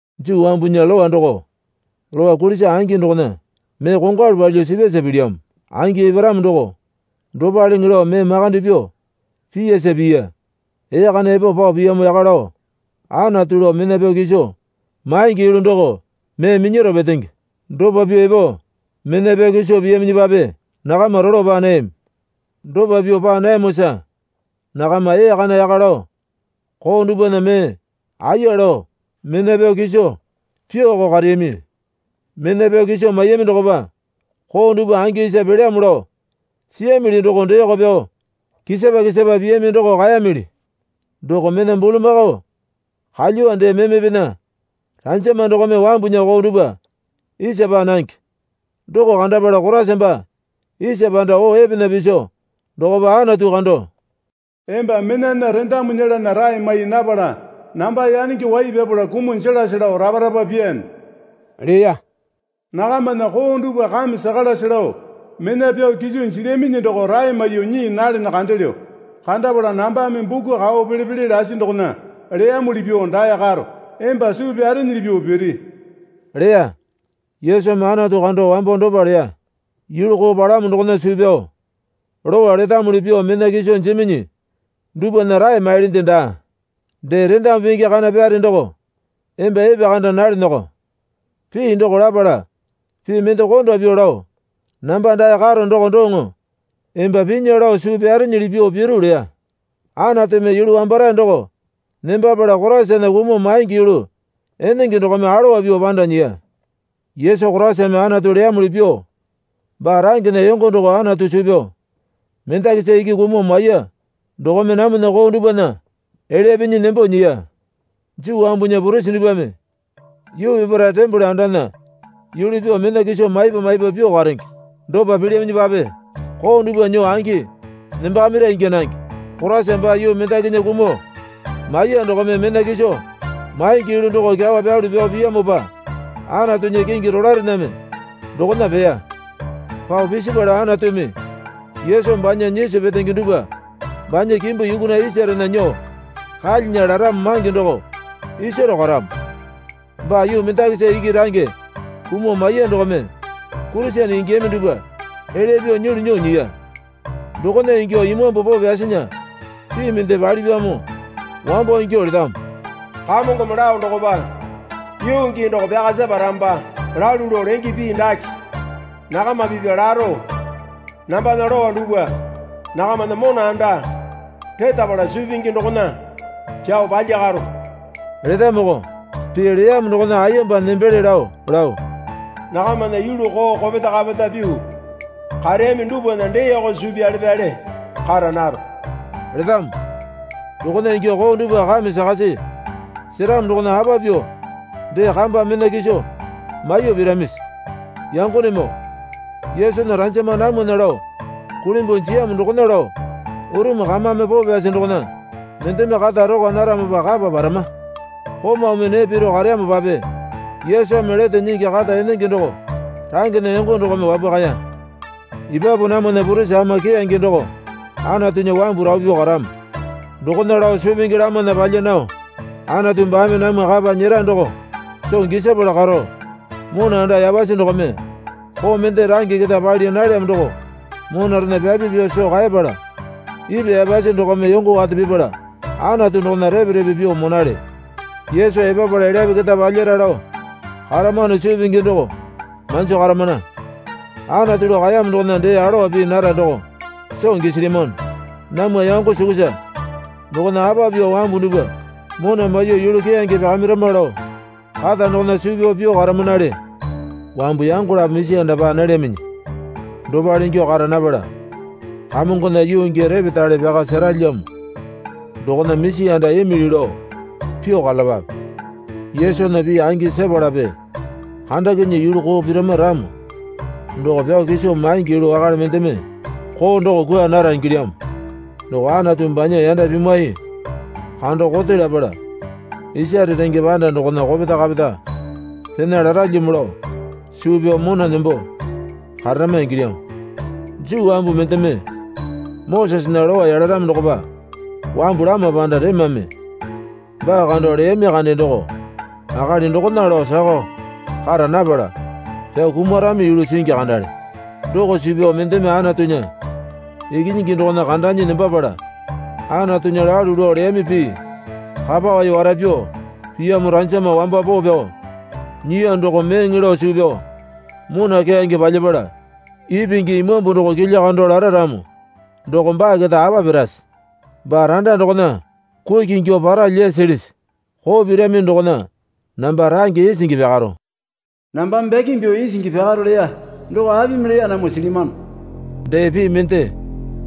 Juu wambunya Lowa doko lowa kulisa angi dokona mee kongwalu palyuo sipyasa pilyamo. Angi eparamo doko dopaleŋe lao mee makande pyuo piyasa piya. Ee kana epo pao piyamo yaka lao Anatu lao mena pyao kiso maingi yulu doko mee minyaro petenge. Dopa pyuo epo mena pyao kiso piyaminyipape nakama rolo paa nayami. Dopa pyuo paa nayamosa nakama ee kana yaka lao koo dupwana mee aiya lao mena pyao kiso pyuoko kareyami. Mena pyao kiso maiyami dokopa koo dupwa angi isa pelyamo lao siyamili doko deeko pyao kisapa kisapa piyami doko kaeyamili. Doko mena bulamakao kalyuwa dee memepena ranjama dokome wambunya koo dupwa isa paa nange. Doko kandapala Koraisa baa isa panda oo epena piso dokopa Anatu kando, Emba menana rendamu nyelana rae mai napala namba yanenge wai pyapala kumuo jelase lao rapa rapa pyaane leya. Nakamana koo dupwa kame sakalase lao mena pyao kiso jilyaminyi doko rae maiyuo nyii nalene kandelyo. Kandapala nambame buku kao pele pele lasi dokona leyamuli pyuo dae karo. Emba suu pyarenyili pyuo piri leya. Yesumi Anatu kando wambo dopa leya. Yulu koo palamo dokona suu pyao Lowa letamuli pyuo mena kiso jiminyi dupwana rae mailyinde daa. Dee rendamu pingi kana pyare doko emba epekanda nalenyako. Pii doko lapala pii mende konda pyuo lao, Namba dae karo doko doŋo. Emba pinya lao suu pyarenyili pyuo piru leya. Anatumi yulu wambarae doko nembapala Koraisana kumuo maingi yulu enenge dokome alowa pyuo panda nyiya. Yesu Koraisame Anatu leyamuli pyuo baa rangena yongo doko Anatu suu pyao mendakisa iki kumuo maiya dokome namwana koo dupwana elya pinyi nembo nyiya. Juu wambunya purisi dupwame yuu peparae tembole andana yulu pyuo mena kiso maipa maipa pyuo karenge. Dopa pilyaminyipape koo dupwa nyuo angi nembakamira ingya nange. Koraisa baa yuu mendakinya kumuo maiyuo dokome mena kiso maingi yulu doko kyawa pyalu pyao piyamopa Anatunya kingi rolaerename dokona peya. Pao pisipala Anatumi Yesu banya nyisu petenge dupwa banya kimbu yukuna isarena nyuo kalyinya laramo mange doko isaro karamo. Baa yuu mendakisa iki range kumuo maiya dokome Kurisene ingiyami dupwa elya pyuo nyulu nyuo nyiya. Dokona ingyuo Imambu Poo Pyasinya pii mende palipyamo wambo ingyuo letamo. Kamongome lao dokopa, yuu gii doko pyaka separamopa lalu lao lenge pii dake nakama pipya laro nambana lowa dupwa nakamana mona anda retapala suu pingi dokona pyao palyakaro letamoko. Pii leyamo dokona ayemba nembele lao lao, Nakamana yulu koo kopeta kapeta pyuo kareyami dupwana deeko suu pyale pyale kara naro letamo. Dokona ingyuo koo dupwa kame sakasi seramo dokona apa pyuo dee kamba mena kiso maiyuo piramisi? Yangonemoo Yesunya ranjama namwana lao kulimbuo jiyamo dokona lao urumu kamame poo pyasi dokona mendeme kata rokwa naramopa kapa parama. Komaumi nee piro kareyamopape Yesumi lete nyingi kata enenge doko rangena yongo dokome wapwakaya. Epapu namwana purisi ama keyange doko Anatunya wambu rapu pyuo karamo. Dokona lao suu pingi lamana palya nao Anatu baame namwa kapa nyera doko soo gisapala karo mona anda yapasi dokome koo mende range keta pali nalyamo doko monarena pyapi pyuo soo kaepala ipwa yapasi dokome yongo wate pipala Anatu dokona repe repe pyuo monale. Yesu epapala elyape keta palyara lao karamano suu pingi doko manjo karamana. Anatu lao kaeyamo dokona dee alowa pii nara doko soo gisilyamano. Namwa yango sukusa dokona apa pyuo wambu dupwa mona maiyuo yulu keyange pyakamirama lao kata dokona suu pyao pyuo karamanale. Wambu yango lapo misi anda paa nalyaminyi dopale ingyuo kara napala Kamongona yuu gii repetale pyaka seralyamo dokona misi anda imili lao pyuo karalapape. Yesunya pii angi sepalape kandakinyuo yulu koo pirama ramo doko pyao kiso maingi yulu wakale mendeme koo doko kwua nara ingilyamo. Doko Anatu banya yanda pimwai kando kote lapala isare renge panda dokona kopeta kapeta pena laralyamo lao suu pyao mona nembo kararama ingilyamo. Juu wambu mendeme Mosesena Lowa yalaramo dokopa wambu lama panda remame baa kando leyami kande doko akali dokona lao sakao kara napala pyao kumarami yulu singi kandale. Doko suu pyao mendeme Anatunya Ikinyingi dokona kandanyi nembapala Anatunya lalu lao leyami pii kapa wai wara pyuo piyamo ranjama wamba poo pyao nyiya doko meeŋe lao suu pyao, mona keyange palyapala ipingi Imambu doko kilya kando lara ramo doko baa keta apa pirase? Baa randa dokona kuki ingyuo paralya silisi? Koo pirami dokona namba range isingi pyakaro. Nambame bakeme pyuo isingi pyakaro leya doko apimi leya namwa silyamano. Dee pii mende,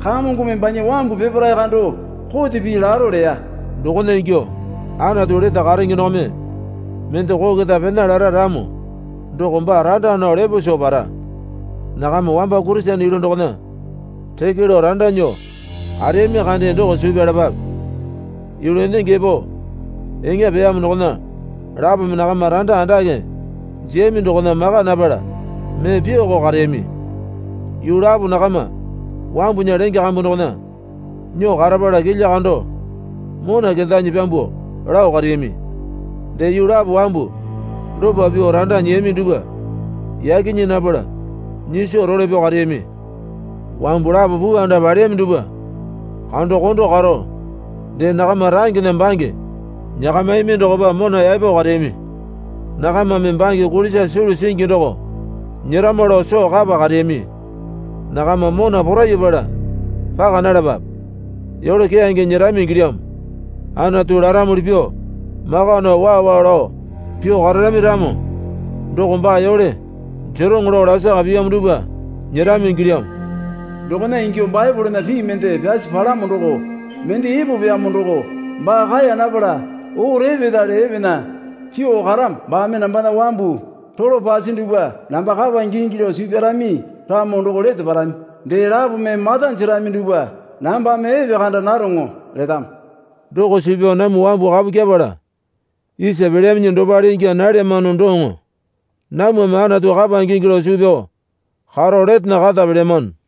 Kamongome banya wambu peparae kando kote pii laro leya. Dokona ingyuo Anatu lete karenge dokome mende koo keta pena lara ramo doko baa randa nao lepo soo para. Nakama wamba Kurisene yulu dokona reke lao randa nyuo kareyami kande doko suu pyalapape. Yulu enenge epo eŋa peyamo dokona lapome nakama randa andake jiyami dokona maka napala mee pyuoko kareyami. Yuu lapo nakama wambunya lenge kambu dokona nyuo karapala kilya kando mona kendanyi pyambuo lao kareyami. Dee yuu lapo wambu dopa pyuo randa nyiyami dupwa yaki nyii napala nyiso role pyao kareyami. Wambu lapo puu anda paleyami dupwa kando kondo karo dee nakama rangena bange nyakamiyami dokopa mona yaepo kareyami. Nakamame bange kulisa sulu singi doko nyerama lao soo kapa kareyami. Nakama mona porayapala paka nalapape. Yole keyange nyerami ingilyamo. Anatu laramuli pyuo maka nao waa waa lao pyuo kararami ramo doko baa yole jeroŋo laa lasaka piyamo dupwa nyerami ingilyamo. Dokona ingyuo Baepolena pii mende pyasi palamo doko. Mende epopyamo doko baa kaeya napala oo repetale epena pyuo karamo. Baame nambana wambu rolo pasi dupwa namba kapa ingingi lao suu pyarami ramo doko lete parami. Dee lapome mata jerami dupwa nambame epekanda naroŋo, letamo. Doko suu pyao namwa wambu kapu kyepala isa pelyaminyi dopale ingya nalyamano doŋo. Namwame Anatu kapa ingingi lao suu pyao karo letena kata pelyamano.